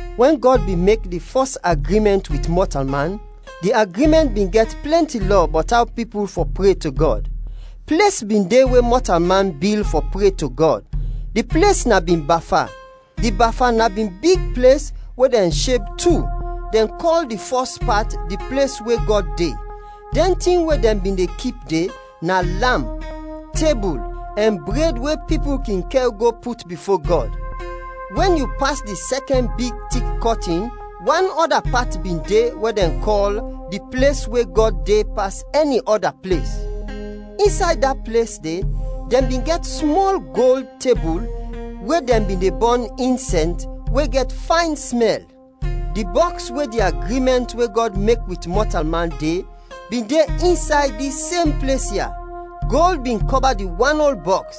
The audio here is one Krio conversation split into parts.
Wɛn Gɔd bin mek di fɔs agrimɛnt wit mɔtalman, di agrimɛnt bin gɛt plɛnti lɔ bɔt aw pipul fɔ pre to Gɔd. Ples bin de we mɔtalman bil fɔ pre to Gɔd. Di ples na bin Bafa. Di Bafa na bin big ples we dɛn sheb tu, dɛn kɔl di fɔs pat “Di ples we Gɔd de”. Dɛn tin we dɛn bin de kip de, na lamp, tebul, ɛn bred we pipul kin kɛr go put bifo Gɔd. Wɛn yu pas di sɛkɛn big tik kɔtin, wan ɔda pat bin de we dɛn kɔl “Di ples we Gɔd de pas ɛni ɔda ples.” Insay da ples de dɛn bin gɛt smɔl gold tebul we dɛn bin de bɔn insɛns we gɛt fayn smɛl. Di bɔks we di agrimɛnt we Gɔd mek wit mɔtalman de, bin de insay dis sem ples ya. Gold bin kɔba di wan ol bɔks.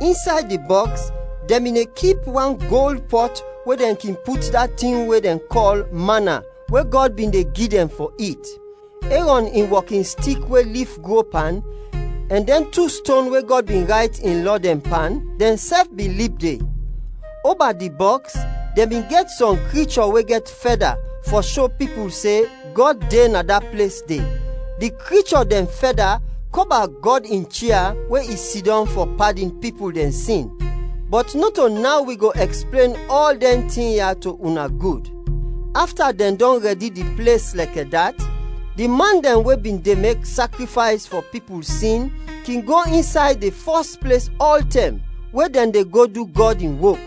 Insay di bɔks dɛn bin de kip wan gold pɔt we dɛn kin put da tin we dɛn kɔl mana we Gɔd bin de gi dɛn fɔ it. Erɔn in wɔkinstik we lif gro pan, ɛn dɛn tu ston we Gɔd bin rayt in lɔ dɛn pan, dɛnsɛf bin lib de. Oba di bɔks dɛn bin gɛt sɔm krichɔ we gɛt fɛda fɔ sho pipul se Gɔd de na da ples de. Di krichɔ dɛn fɛda kɔba Gɔd in chia we i sidɔm fɔ padin pipul dɛn sin. Bɔt nɔto naw wi go ɛksplen ɔl dɛn tin ya to una gud. Afta dɛn dɔn rɛdi di ples lɛkɛ dat, di man dɛn we bin de mek sakrifays fɔ pipul sin kin go insay di fɔs ples ɔltɛm we dɛn de go du Gɔd in wok.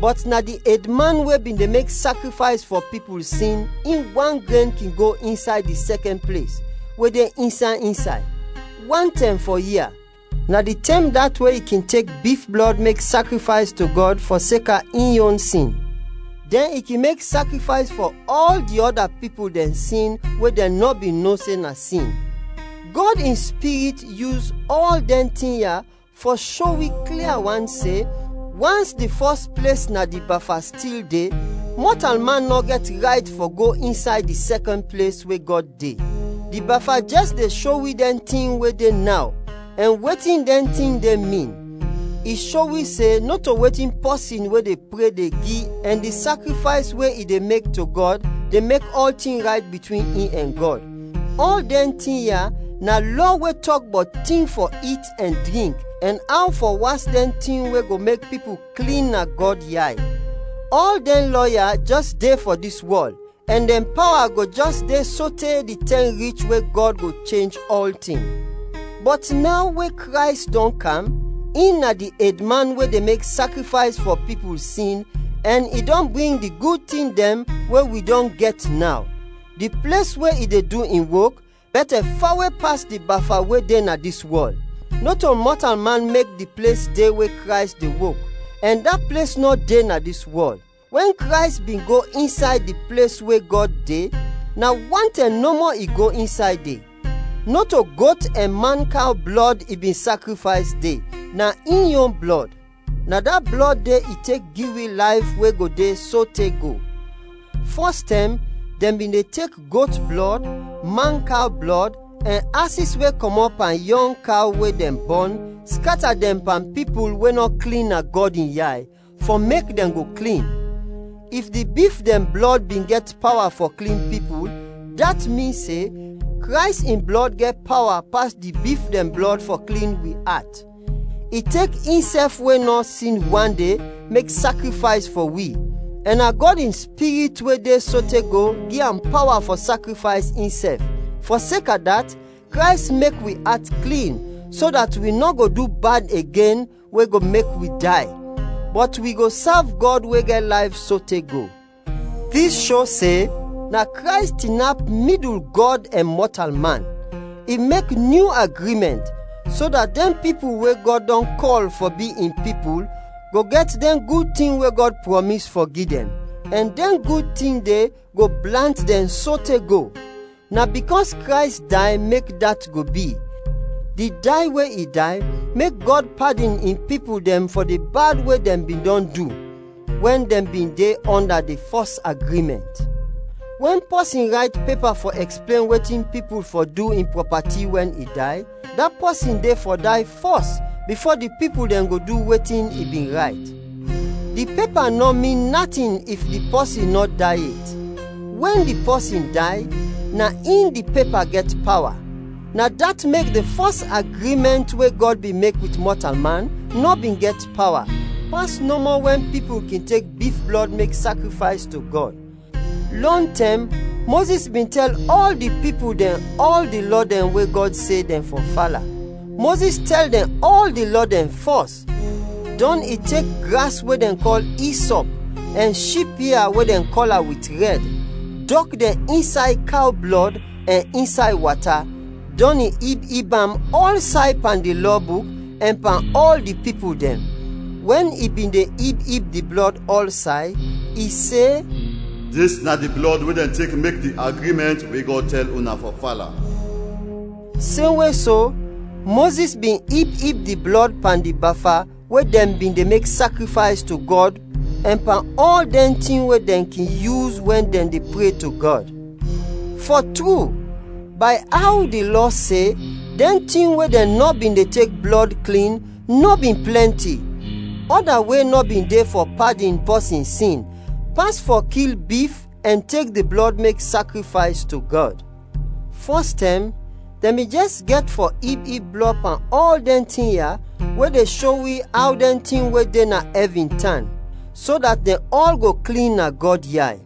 Bɔt na di edman we bin de mek sakrifays fɔ pipul sin, in wan gren kin go insay di sɛkɛn ples we de insay insay, wan tɛm fɔ ia. Na di tɛm dat we i kin tek bif blɔd mek sakrifays to Gɔd fɔseka in yon sin, dɛn i kin mek sakrifays fɔ ɔl di ɔda pipul dɛn sin we dɛn nɔ bin no se na sin. Gɔd in Spirit yus ɔl dɛn tin ya fɔ sho wi klia wan se, wans di fɔs ples na di Bafa stil de, mɔtalman nɔ gɛt rayt fɔ go insay di sɛkɛn ples we Gɔd de. Di Bafa jɛs de sho wi dɛn tin we de naw, ɛn wetin dɛn tin de min. I sho wi se nɔto wetin pɔsin we de pre de gi ɛn di sakrifays we i de mek to Gɔd de mek ɔltin rayt bitwin in ɛn Gɔd. Ɔl dɛn tin ya na lɔ we tɔk bɔt tin fɔ it ɛn drink ɛn aw fɔ was dɛn tin we go mek pipul klin na Gɔd yay. Ɔl dɛn lɔ ya jɛs de fɔ dis wɔl, ɛn dɛn pawa go jɛs de sote di tɛm rich we Gɔd go chenj ɔltin. Bɔt naw we Krays dɔn kam, in na di edman we de mek sakrifays fɔ pipul sin ɛn i dɔn bring di gud tin dɛn we wi dɔn gɛt naw. Di ples we i de du in wok bɛtɛ fawe pas di Bafa we de na dis wɔl. Nɔto mɔtalman mek di ples de we Krays de wok, ɛn da ples nɔ de na dis wɔl. Wɛn Krays bin go insay di ples we Gɔd de, na wan tɛm nɔmɔ i go insay de. Nɔto got ɛn mankaw blɔd i bin sakrifays de, na in yon blɔd. Na da blɔd de i tek gi wi layf we go de sote go. Fɔstɛm dɛn bin de tek got blɔd, mankaw blɔd, ɛn asis we kɔmɔt pan yɔng kaw we dɛn bɔn skata dɛn pan pipul we nɔ klin na Gɔd in yay, fɔ mek dɛn go klin. If di bif dɛn blɔd bin gɛt pawa fɔ klin pipul, dat min se, Krays in blɔd gɛt pawa pas di bif dɛn blɔd fɔ klin wi at. I tek insɛf we nɔ sin wande, mek sakrifays fɔ wi, ɛn na Gɔd in Spirit we de sote go gi am pawa fɔ sakrifays insɛf. Fɔseka dat, Krays mek wi at klin, so dat wi nɔ go du bad igen we go mek wi day, bɔt wi go sav Gɔd we gɛt layf sote go. Dis sho se na Krays tinap midul Gɔd ɛn mɔtalman, i mek nyu agrimɛnt, so dat dɛn pipul we Gɔd dɔn kɔl fɔ bi in pipul go gɛt dɛn gud tin we Gɔd prɔmis fɔ gi dɛn, ɛn dɛn gud tin de go blant dɛn sote go. Na bikɔs Krays day mek dat go bi, di day we i day mek Gɔd padin in pipul dɛn fɔ di bad we dɛn bin dɔn du, wɛn dɛn bin de ɔnda di fɔs agrimɛnt. Wɛn pɔsin rayt pepa fɔ ɛksplen wetin pipul fɔ du in prɔpati wɛn i day, da pɔsin de fɔ day fɔs bifo di pipul dɛn go du wetin i bin rayt. Di pepa nɔ min natin if di pɔsin nɔ day yet. Wɛn di pɔsin day, na in di pepa gɛt pawa. Na dat mek di fɔs agrimɛnt we Gɔd bin mek wit mɔtalman nɔ bin gɛt pawa, pas nɔmɔ wɛn pipul kin tek bif blɔd mek sakrifays to Gɔd. Lɔntɛm, Mozis bin tɛl ɔl di pipul dɛn ɔl di lɔ dɛn we Gɔd se dɛn fɔ fala. Mozis tɛl dɛn ɔl di lɔ dɛn fɔs, dɔn i tek gras we dɛn kɔl “isɔp” ɛn ship ia we dɛn kɔla wit rɛd, dɔk dɛn insay kaw blɔd ɛn insay wata, dɔn i ib ib am ɔlsay pan di Lɔ buk ɛn pan ɔl di pipul dɛn. Wɛn i bin de ib ib di blɔd ɔlsay, i se, “Dis na di blɔd we dɛn tek mek di agrimɛnt we Gɔd tɛl una fɔ fala.” Semwe so, Mozis bin ib ib di blɔd pan di Bafa we dɛn bin de mek sakrifays to Gɔd ɛn pan ɔl dɛn tin we dɛn kin yus wɛn dɛn de pre to Gɔd. Fɔ tru, bay aw di Lɔ se, dɛn tin we dɛn nɔ bin de tek blɔd klin nɔ bin plɛnti. Ɔda we nɔ bin de fɔ padin pɔsin sin, pas fɔ kil bif ɛn tek di blɔd mek sakrifays to Gɔd. Fɔstɛm, dɛn bin jɛs gɛt fɔ ib ib blɔd pan ɔl dɛn tin ya we de sho wi aw dɛn tin we de na ɛvin, tan, so dat dɛn ɔl go klin na Gɔd yay.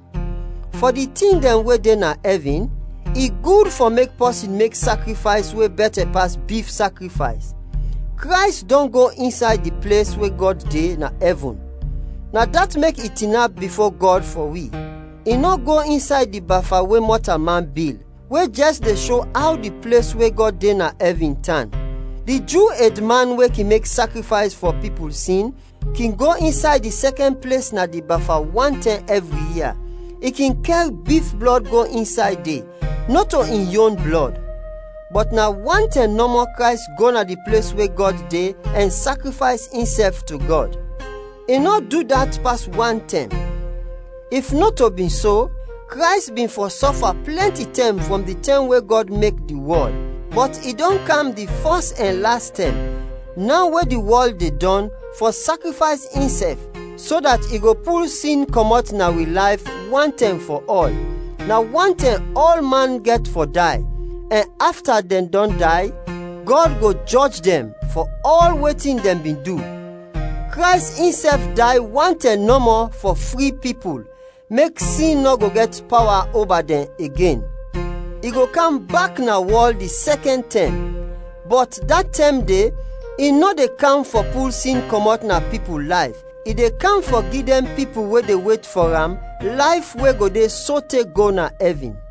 Fɔ di tin dɛn we de na ɛvin, i gud fɔ mek pɔsin mek sakrifays we bɛtɛ pas bif sakrifays. Krays dɔn go insay di ples we Gɔd de na ɛvin. Na dat mek i tinap bifo Gɔd fɔ wi. I nɔ go insay di Bafa we mɔtalman bil, we jɛs de sho aw di ples we Gɔd de na ɛvin, tan. Di Ju edman we kin mek sakrifays fɔ pipul sin, kin go insay di sɛkɛn ples na di Bafa wan tɛm ɛvri ia; i kin kɛr bif blɔd go insay de, nɔto in yon blɔd. Bɔt na wan tɛm nɔmɔ Krays go na di ples we Gɔd de ɛn sakrifays insɛf to Gɔd. I nɔ du dat pas wan tɛm. If nɔto bin so, Krays bin fɔ sɔfa plɛnti tɛm frɔm di tɛm we Gɔd mek di wɔl. Bɔt i dɔn kam di fɔs ɛn las tɛm, naw we di wɔl de dɔn, fɔ sakrifays insɛf, so dat i go pul sin kɔmɔt na wi layf, wan tɛm fɔ ɔl. Na wan tɛm ɔlman gɛt fɔ day, ɛn afta dɛn dɔn day Gɔd go jɔj dɛn fɔ ɔl wetin dɛn bin du. Krays insɛf day wan tɛm nɔmɔ fɔ fri pipul, mek sin nɔ go gɛt pawa oba dɛn igen. I go kam bak na wɔl di sɛkɛn tɛm, bɔt da tɛm de i nɔ de kam fɔ pul sin kɔmɔt na pipul layf, i de kam fɔ gi dɛn pipul we de wet fɔ am layf we go de sote go na ɛvin.